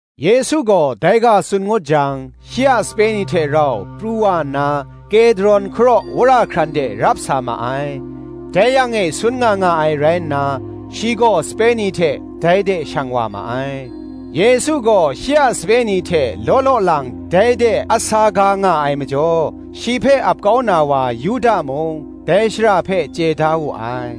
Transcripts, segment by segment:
Yesu gaw dai ga tsun ngut jang, shi a sape ni hte rau pru wa nna, Kedron hkaraw wora hkran de rap sa ma ai: dai yang e sun nga nga ai rai nna, shi gaw sape ni hte dai de shang wa ma ai. Yesu gaw shi a sape ni hte law law lang dai de a sa ga nga ai majaw, shi hpe ap kau na wa Yuda mung, dai shara hpe chye da wu ai.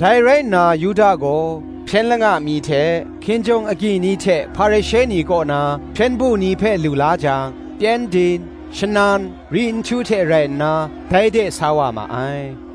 Dai rai nna Yuda gaw, hpyen langa ni hte, Hkinjawng agyi ni hte Hparishe ni kaw na, hpyen du ni hpe lu la jang, pyengdin, shanan, ri nhtu hte rai nna, dai de sa wa ma ai.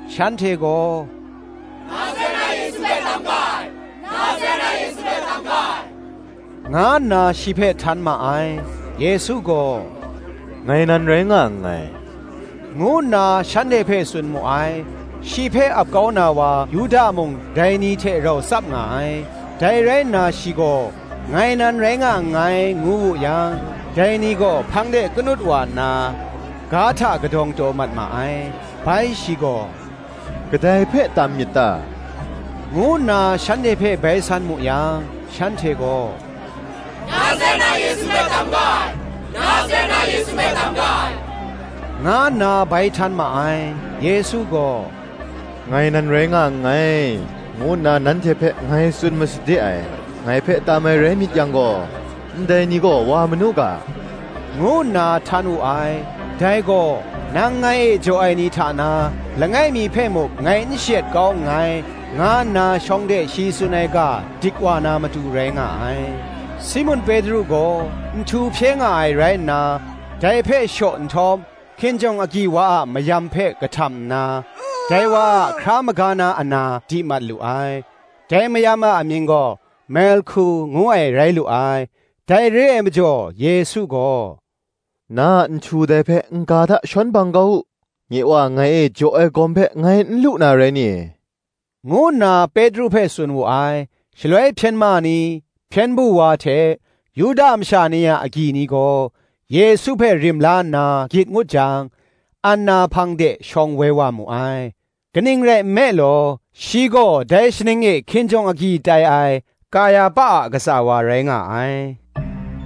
Shanhte gaw, Nazaret na Yesu hpe tam ga ai, nga nna shi hpe htan ma ai. Yesu gaw, “Ngai nan rai nga nngai,” ngu nna shanhte hpe tsun mu ai. Shi hpe ap kau na wa Yuda mung dai ni hte rau tsap nga ai. Dai rai nna shi gaw, “Ngai nan rai nga nngai, ngu wu yang, dai ni gaw hpang de kanut wa nna, ga hta kadawng taw mat ma ai. Bai shi gaw, “Kadai hpe tam myit ta?” ngu nna shanhte hpe bai san mu yang, shanhte gaw, “Nazaret na Yesu hpe tam ga ai,” nga nna bai htan ma ai. Yesu gaw, “Ngai nan rai nga nngai,” ngu nna nanhte hpe ngai tsun masade ai: “ngai hpe tam ai rai myit yang gaw, ndai ni gaw wa manu ga,” ngu nna htan wu ai: dai gaw, Nang ngai e jaw ai ni hta na, langai mi hpe muk ngai n shayet kau nngai, nga nna shawng de shi tsun ai ga dik wa na matu, rai nga ai. Simun Petru gaw nhtu hpye nga ai rai nna, dai hpe shaw nhtawm, hkinjawng agyi wa a mayam hpe kahtam nna, dai wa a hkra maga na ana di mat lu ai: dai mayam a amying gaw Malhku ngu ai rai lu ai. Dai re ai majaw Yesu gaw, “Na a nhtu dai hpe n-ga hta shawn bang kau u: nye Wa ngai e jaw ai gawm hpe ngai n lu na rai ni?” ngu nna Petru hpe tsun wu ai. Shaloi hpyen ma ni, hpyen du wa hte, Yuda masha ni a agyi ni gaw, Yesu hpe rim la nna gyit ngut jang, Anna hpang de shawng woi wa mu ai: kaning rai nme law, shi gaw dai shaning e hkinjawng agyi tai ai, Kayahpa a katsa wa rai nga ai.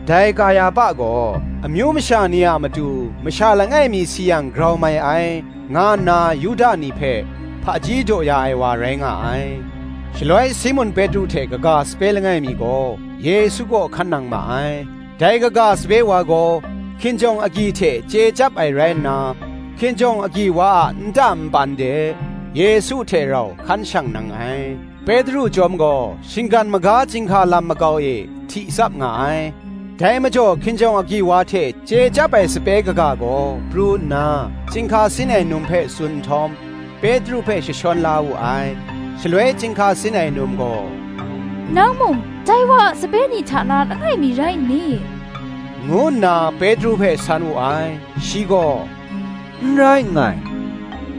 Dai Kayahpa gaw, Amyu masha ni a matu masha langai mi si yang grau mai ai, nga nna Yuda ni hpe hpaji daw ya ai wa rai nga ai. Shaloi Simun Petru hte kaga sape langai mi gaw, Yesu kaw hkan nang ma ai. Dai kaga sape wa gaw, hkinjawng agyi hte chye chyap ai rai nna, hkinjawng agyi wa a nta npan de, Yesu hte rau hkan shang nang ai: Petru chyawm gaw shinggan maga chyinghka lam makau e hti tsap nga ai. Dai majaw hkinjawng agyi wa hte chye chyap ai sape kaga gaw pru nna, chyinghka sin ai num hpe tsun nhtawm, Petru hpe jashawn la wu ai. Shaloi chyinghka sin ai num gaw, “Nang mung dai wa a sape ni hta na langai mi rai nni?” ngu nna Petru hpe san wu ai. Shi gaw, “N rai nngai,”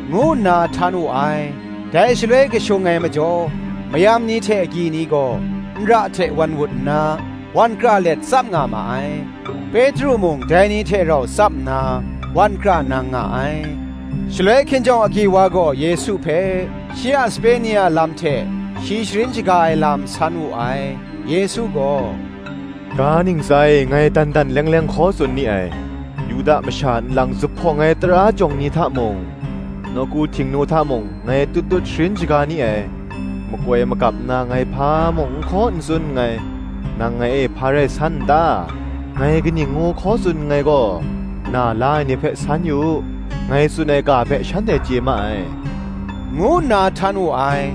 ngu nna htan wu ai. Dai shaloi kashung ai majaw, mayam ni hte agyi ni gaw, nra hte wan wut nna, wan kra let tsap nga ma ai: Petru mung dai ni hte rau tsap nna, wan kra nang nga ai. Shaloi hkinjawng agyi wa gaw Yesu hpe, shi a sape ni a lam hte shi sharin shaga ai lam, san wu ai. Yesu gaw, “Ga ntsa e ngai dan dan leng leng hkaw tsun ni ai: Yuda masha nlang zuphpawng ai Tara jawng ni hta mung, nawku Htingnu hta mung ngai tut tut sharin shaga ni ai: makoi magap nna ngai hpa mung n hkaw n tsun nngai. Nang ngai e hpa rai san n ta? Ngai kaning ngu hkaw tsun nngai gaw, na la ai ni hpe san yu u; ngai tsun ai ga hpe shanhte chye ma ai, ngu nna htan wu ai.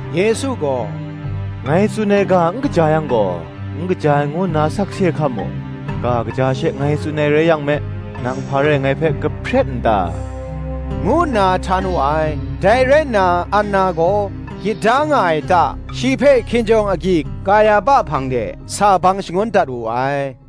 Yesu gaw, “Ngai tsun ai ga n kaja yang gaw, n kaja ai ngu nna sakse hkam u; ga kaja she ngai tsun ai rai yang me, nang hpa rai ngai hpe kahpret n ta?” ngu nna htan wu ai. Dai rai nna Anna gaw, gyit da nga ai ta, shi hpe hkinjawng agyi Kayahpa hpang de sa bang shangun dat wu ai.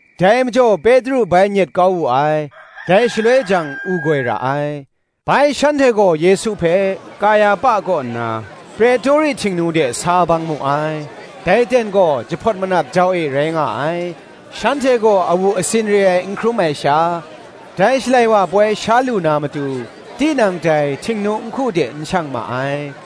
Dai majaw Petru bai nyet kau wu ai: dai shaloi jang u goi ra ai. Bai shanhte gaw Yesu hpe, Kayahpa kaw nna Pretori Htingnu de sa bang mu ai: dai ten gaw jahpawt manap jau e rai nga ai: shanhte gaw awu asin re ai n hkrum ai sha, dai Shalai wa ai poi sha lu na matu, tinang dai Htingnu nhku de n shang ma ai.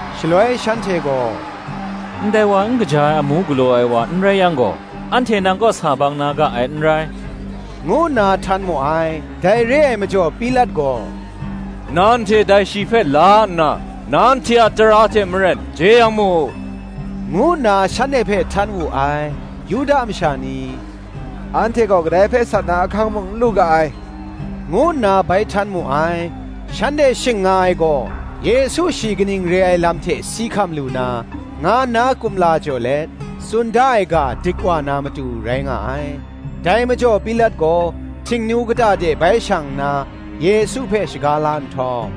Shaloi shanhte gaw “Ndai wa n kaja ai amu galaw ai wa n rai yang gaw, anhte nang kaw sa bang na ga ai n rai,” ngu nna htan mu ai. Dai re ai majaw Pilat gaw, “Nanhte dai shi hpe la nna nanhte a tara hte maren jeyang mu,” ngu nna shanhte hpe htan wu ai. Yuda masha ni gaw, “Anhte gaw kadai hpe sat na ahkang mung n lu ga ai,” ngu nna bai htan mu ai. Shanhte shing nga ai gaw, Yesu shi kaning re ai lam hte si hkam lu na, nga nna kumla jaw let, tsun da ai ga dik wa na matu, rai nga ai. Dai majaw Pilat gaw Htingnu kata de bai shang nna, Yesu hpe shaga la nhtawm,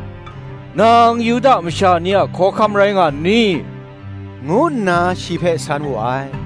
“Nang Yuda masha ni a hkawhkam rai nga nni?” ngu nna shi hpe san wu ai.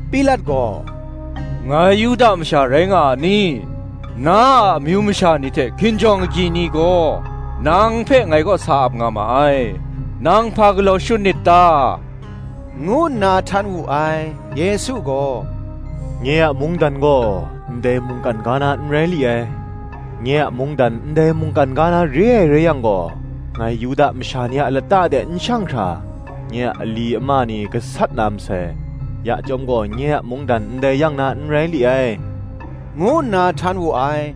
Pilat gaw, “Ngai Yuda masha rai nga a ni? Na a amyu masha ni hte hkinjawng agyi ni gaw, nang hpe ngai kaw sa ap nga ma ai; nang hpa galaw shut nit ta?” ngu nna htan wu ai. Yesu gaw, “Nye a mungdan gaw ndai mungkan ga na n rai li ai; nye a mungdan ndai mungkan ga na re ai rai yang gaw, ngai Yuda masha ni a lata de n shang hkra, nye a ali ama ni gasat na masai: ya chyawm gaw nye a mungdan ndai yang na n rai li ai,” ngu nna htan wu ai.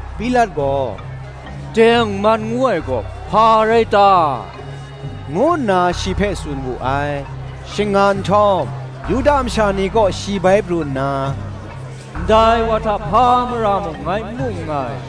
Pilat gaw, “Tengman ngu ai gaw hpa rai ta?” ngu nna shi hpe tsun wu ai. Shing nga nhtawm Yuda masha ni kaw shi bai pru nna, “Ndai wa hta hpa mara mung ngai n mu nngai.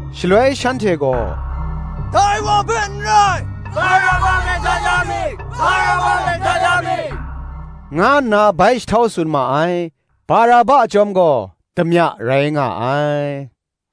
Shaloi shanhte gaw, “Dai wa hpe n rai, Baraba hpe dat ya mi,” nga nna bai jahtau tsun ma ai: Baraba chyawm gaw damya rai nga ai.